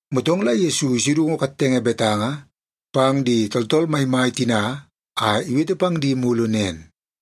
Motong la Yesu isudungu kattenge betanga pang di tooltool maimai tina a iwete pang di mulu nen,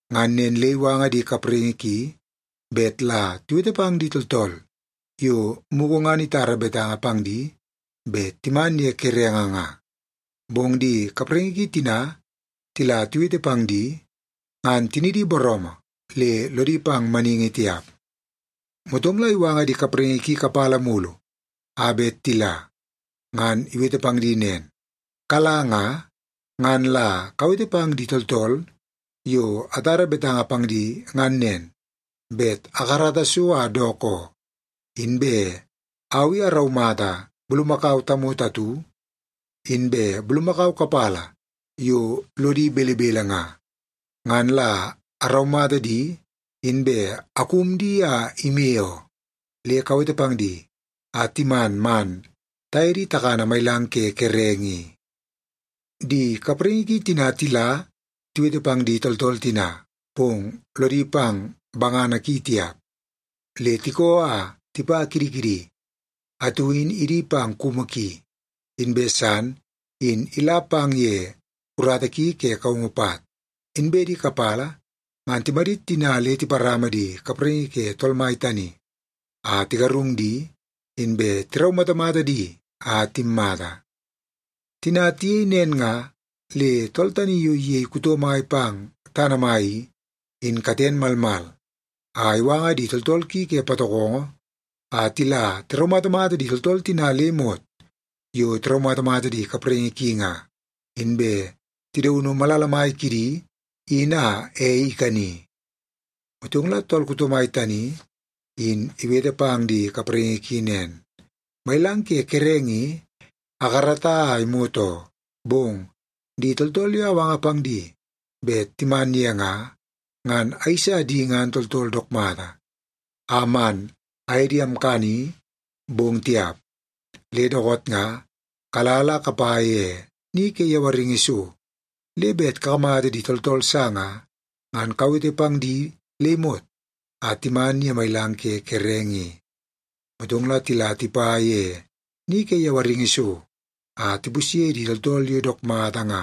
Ngan nen le iwanga di kapraingi ki bet la tiwete pang di tooltool yo mugu ngan itara betanga pang di bet timan ye kerenge nga. Bong di kapraingi ki tina tila tiwete pang di, ngan tinidi booroomoo le lodi pang maningi tiap. “Motong la iwanga di kapraingi ki kapala mulu a bet tila, ngan iwete pang di nen, ‘Kala nga, ngan la kawete pang di tooltool yo atara betanga pang di ngan nen, bet akarata so a dook oo. Inbe au i araumata bulumakau tamoto atu, inbe bulumakau kapala yo lodi belebele nga, ngan la araumata di inbe akum di a ime oo. Le kawete pang di a timan man taye di takana mailang ke kerenge i.’ “Di kapraingi ki tina tila tiwete pang di tooltool tina, bong lodi pang bangana ki tiap, le tikoo a tipa kidi kidi. Atu in idi pang kumu ki, inbe san in ila pang ye urata ki ke kaungu pat. Inbe di kapala ngan timadit tina le tiparama di kapraingi ke tool mai tani, a tigarung di, inbe tiraumatamata di a timmata. Tina tiyei nen nga, le tool tani yo iyei kuto mai pang tana mai i, in katen malmal a iwanga di tooltool ki ke patokongo a tila tiraumatamata di tooltool tina le imot yo tiraumatamata di kapraingi ki nga, inbe tidaunu malala mai kidi in a ei ikani. “Motong la tool kuto mai tani in iwete pang di kapraingi ki nen, ‘Mailang ke kerenge i akarata a imot oo, bong di tooltool yo awanga pang di bet timan ye nga, ngan ayeisa di ngan tooltool dook mata a man aye di amkani, bong tiap. Le dookoot nga kala la kapa ye ni ke yawaringi so, le bet kakamata di tooltool sa nga, ngan kawete pang di le imot a timan ye mailang ke kerenge i.’ Motong la tila tipa ye ni ke yawaringi so a tipusye di tooltool yo dook mata nga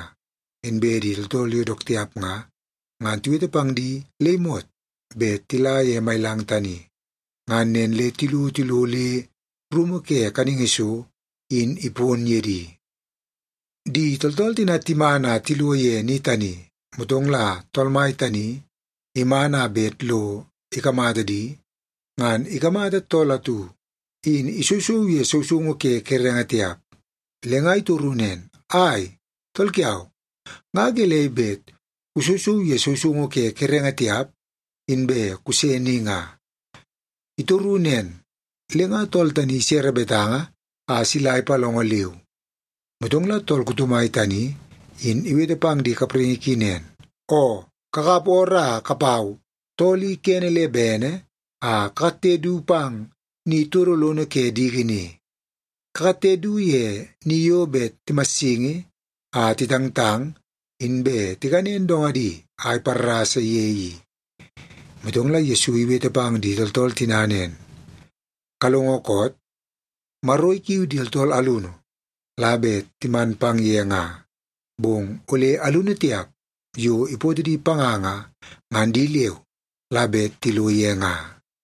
inbe di tooltool yo dook tiap nga, ngan tiwete pang di le imot bet tila ye mailang tani. Ngan nen le tilo tilo le rumu ke kaningi so in ipon ye di. “Di tooltool tina timan a tilo ye ni tani, motong la tool mai tani iman a bet lo ikamata di, ngan ikamata tool atu in isousou ye sousoungu ke kerenge tiap. Le nga itoru nen, ‘Ai, tool kiau, nga gelei bet kusousou ye sousoungu ke kerenge tiap, inbe kuse ni nga?’ Itoru nen, le nga tool tani isere betanga a sila ipalongo leu. “Motong la tool kuto mai tani, in iwete pang di kapraingi ki nen, ‘Oo, kakap ooroo a kapau tool i kene le bene a kakatte du pang ni todo lono ke diki ni. Kakatte du ye ni yo bet timassingi a titangtang inbe tikanen dongadi a iparrasa ye i.’” Motong la Yesu iwete pang di tooltool tina nen, “Kalongo koot? Maro ikiu di tooltool alunu la bet timan pang ye nga, bong ole alunu tiap yo ipootoo di panga nga, ngan di leu la bet tilo ye nga.”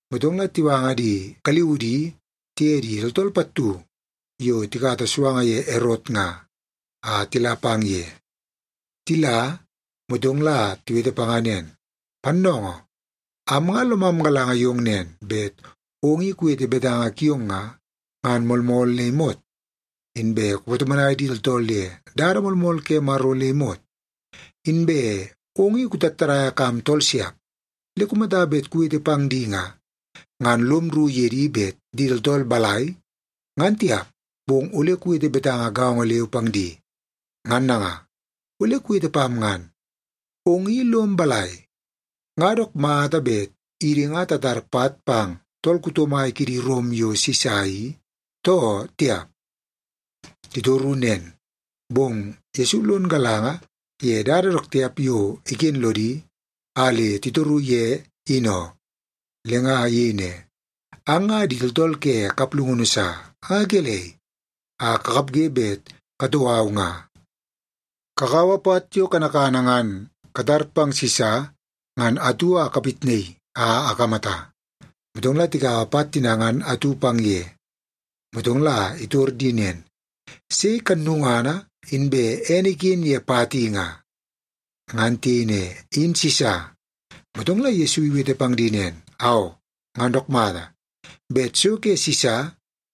Motong la tiwanga di galiudi tiye di tooltool pattu yo tikata suanga ye Erot nga, a tila pang ye. Tila, motong la tiwete panga nen, “Pannoongoo, am nga lomam galanga yong nen, bet ong i kuwete betanga kiong nga, ngan moolmool le imot. Inbe kupatomonai di tooltool ye dada moolmool ke Maro le imot. Inbe ong i kutattadaia kam tooltool siap. Le kumata bet kuwete pang di nga, ngan lom rru ye di bet di tooltool balai, ngan tiap, bong ole kuwete betanga gaongo leu pang di. Ngan nanga, ole kuwete pam ngan. Ong i lom balai? Nga dook mata bet idi nga tatar pat pang tool kuto mai kidi Rom yo Sisa i, too tiap?” Titoru nen, bong Yesu lon galanga ye dada dook tiap yo iken lodi a le titoru ye in oo. Le nga iyei ne, “Ang nga di tooltool ke kaplungunu sa! Nga gelei a kakapge bet katou au nga? Kakaua pat yo kanakana ngan tatar pang Sisa ngan atu a kapitnaii a akamata.” Motong la tikaua pat tina ngan atu pang ye. Motong la itor di nen, “Sei kannungana inbe ene iken ye pat i nga?” Ngan tiyei ne, “In Sisa.” Motong la Yesu iwete pang di nen, “Aoo, ngan dook mata! Bet so ke Sisa,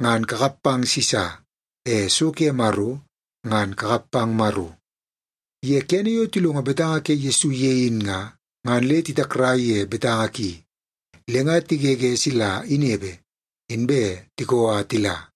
ngan kakap pang Sisa. E so ke Maro, ngan kakap pang Maro.” Ye kene yo tilongo betanga ke Yesu ye in nga, ngan le titakrai ye betanga ki. Le nga tigege sila inepe, inbe tikoo a tila.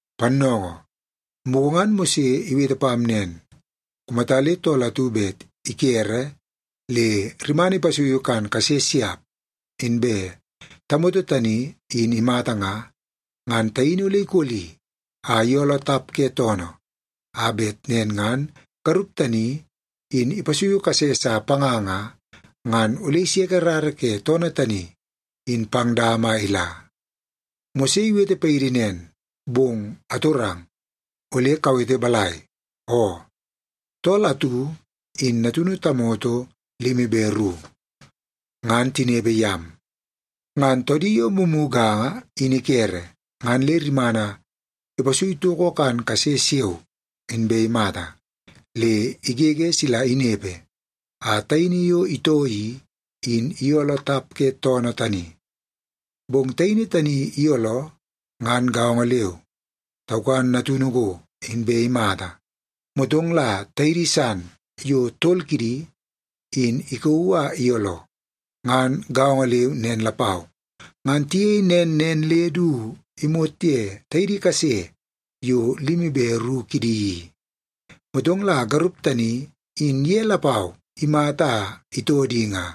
“Pannoongoo, mugu ngan Mose iwete pam nen. Kumata le tool atu bet ikere le rimana ipasuiu kan kase siap, inbe tamoto tani in imata nga, ngan taini ole ikoli a iyooloo tap ke toonoo, a bet nen ngan garup tani in ipasui kase sa panga nga, ngan ole iseke rara ke toonoo tani in pang dama a ila. Mose iwete paidi nen, bong amtorong, ole kuwete balai? Oo, tool atu in natunu tamoto limi be ru, ngan tinepe yam. Ngan toodi yo mumuganga in ikere, ngan le rimana ipasui toko kan kase siao, inbe imata. Le igege sila inepe a taini yo itoo i, in iyooloo tap ke toonoo tani. Bong taini tani iyooloo, ngan gaongo leu, taukan natunu go, inbe imata. Motong la taidi san yo tol kidi, in ikauu a iyooloo, ngan gaongo leu nen lapau. Ngan tiyei nen nen le du imot ye taidi kase yo limi be ru kidi i. Motong la garup tani in ye lapau imata a itoo di nga.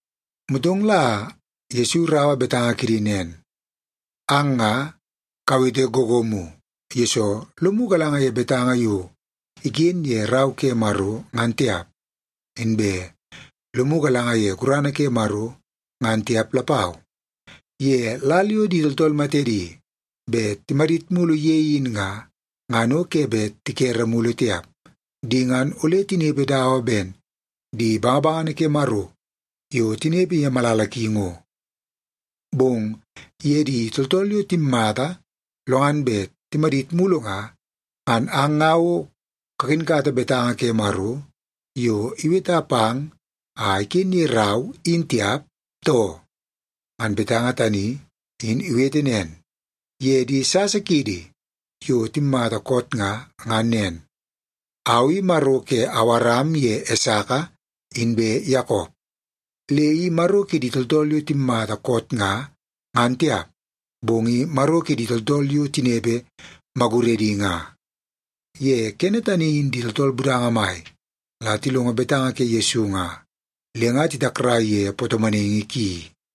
Motong la Yesu iraua betanga kidi nen, “Ang nga kawete googoomu, yesoo lomu galanga ye betanga yo iken ye Rau ke Maro, ngan tiap. Inbe lomu galanga ye gurana ke Maro, ngan tiap lapau. Ye lal yo di tooltool matedi bet timadit mulu ye in nga, ngan o ke bet tikere mulu tiap. Di ngan ole tinepe dawa ben di bangabangana ke Maro yo tinepe ye malala ki ngo. Bong ye di tooltool yo timmata lo ngan bet timadit mulu nga, ngan ang nga o kakinkata betanga ke Maro yo iweta pang a iken ye rau, in tiap, too? Ngan betanga tani in iwete nen ye di sasa kiidi yo timmata koot nga, ngan nen, ‘Au i Maro ke Awaram ye Esaka inbe Yakop.’ Le i Maro kidi tooltool yo timmata koot nga, ngan tiap, bong i Maro kidi tooltool yo tinepe maguredi nga.” Ye kene tani in di tooltool budanga mai la tilongo betanga ke Yesu nga, le nga titakrai ye patomonaingi ki.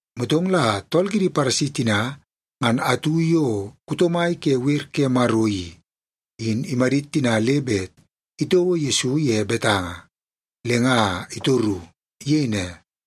Motong la tool kidi Paresi tina ngan atu yo kuto mai ke wer ke Maro i, in imadit tina le bet itouo Yesu ye betanga, le nga itoru. Iyei ne,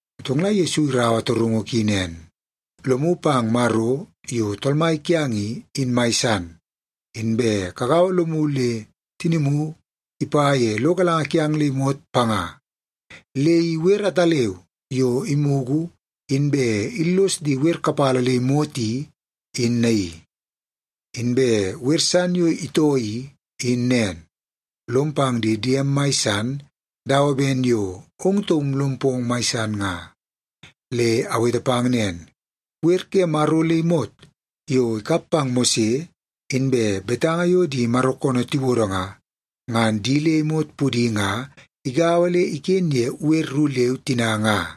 Motong la Yesu iraua torungu ki nen, “‘Lomu pang Maro yo Tool Mai kiang i, in mai san, inbe kagaua lomu le tinimu ipa ye lo galanga kiang le imot panga.’ Le i wer ataleu yo imugu inbe illos di wer kapala le imot i, in naii. Inbe wer san yo itoo i, in nen. ‘Lom pang di diem mai san dawa ben yo ong taum lom pong mai san nga.’ Le awete pang nen, wer ke Maro le imot yo ikap pang Mose, inbe betanga yo di Maro koonoo tiwodo nga, ngan di le imot pudi nga igaua le iken ye wer ru leu tina nga.”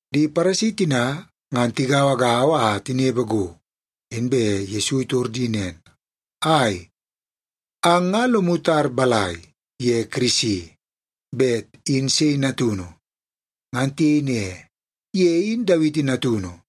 Di Paresi tina ngan tigauagaua a tinepe go, inbe Yesu itor di nen, “Ai, ang nga lomu tar balai ye Kirisi? Bet in sei natunu?” Ngan tiyei ne, “Ye in Dawiti natunu.”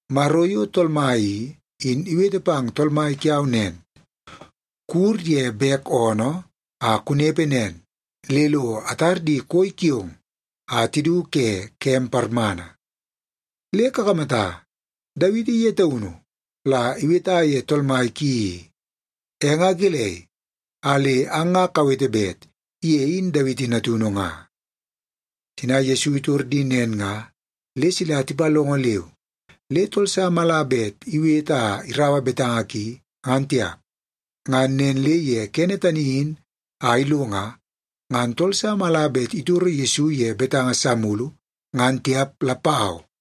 ‘Maro yo Tool Mai i, in iwete pang Tool Mai kiau nen, “Kuwur ye bek oonoo a kunepe nen le lo atar di koi kiong a tidu ke kem parmana.” ’ Le kakamata, Dawiti ye taunu la iweta ye Tool Mai ki i. E nga gelei a le ang nga kawete bet ye in Dawiti natunu nga?” Tina Yesu itor di nen nga, le sila tipalongo leu. Le tool sa mala bet iwete a iraua betanga ki, ngan tiap. Ngan nen le ye kene tani in a ilo nga, ngan tool sa mala bet itoro Yesu ye betanga sa mulu, ngan tiap lapau.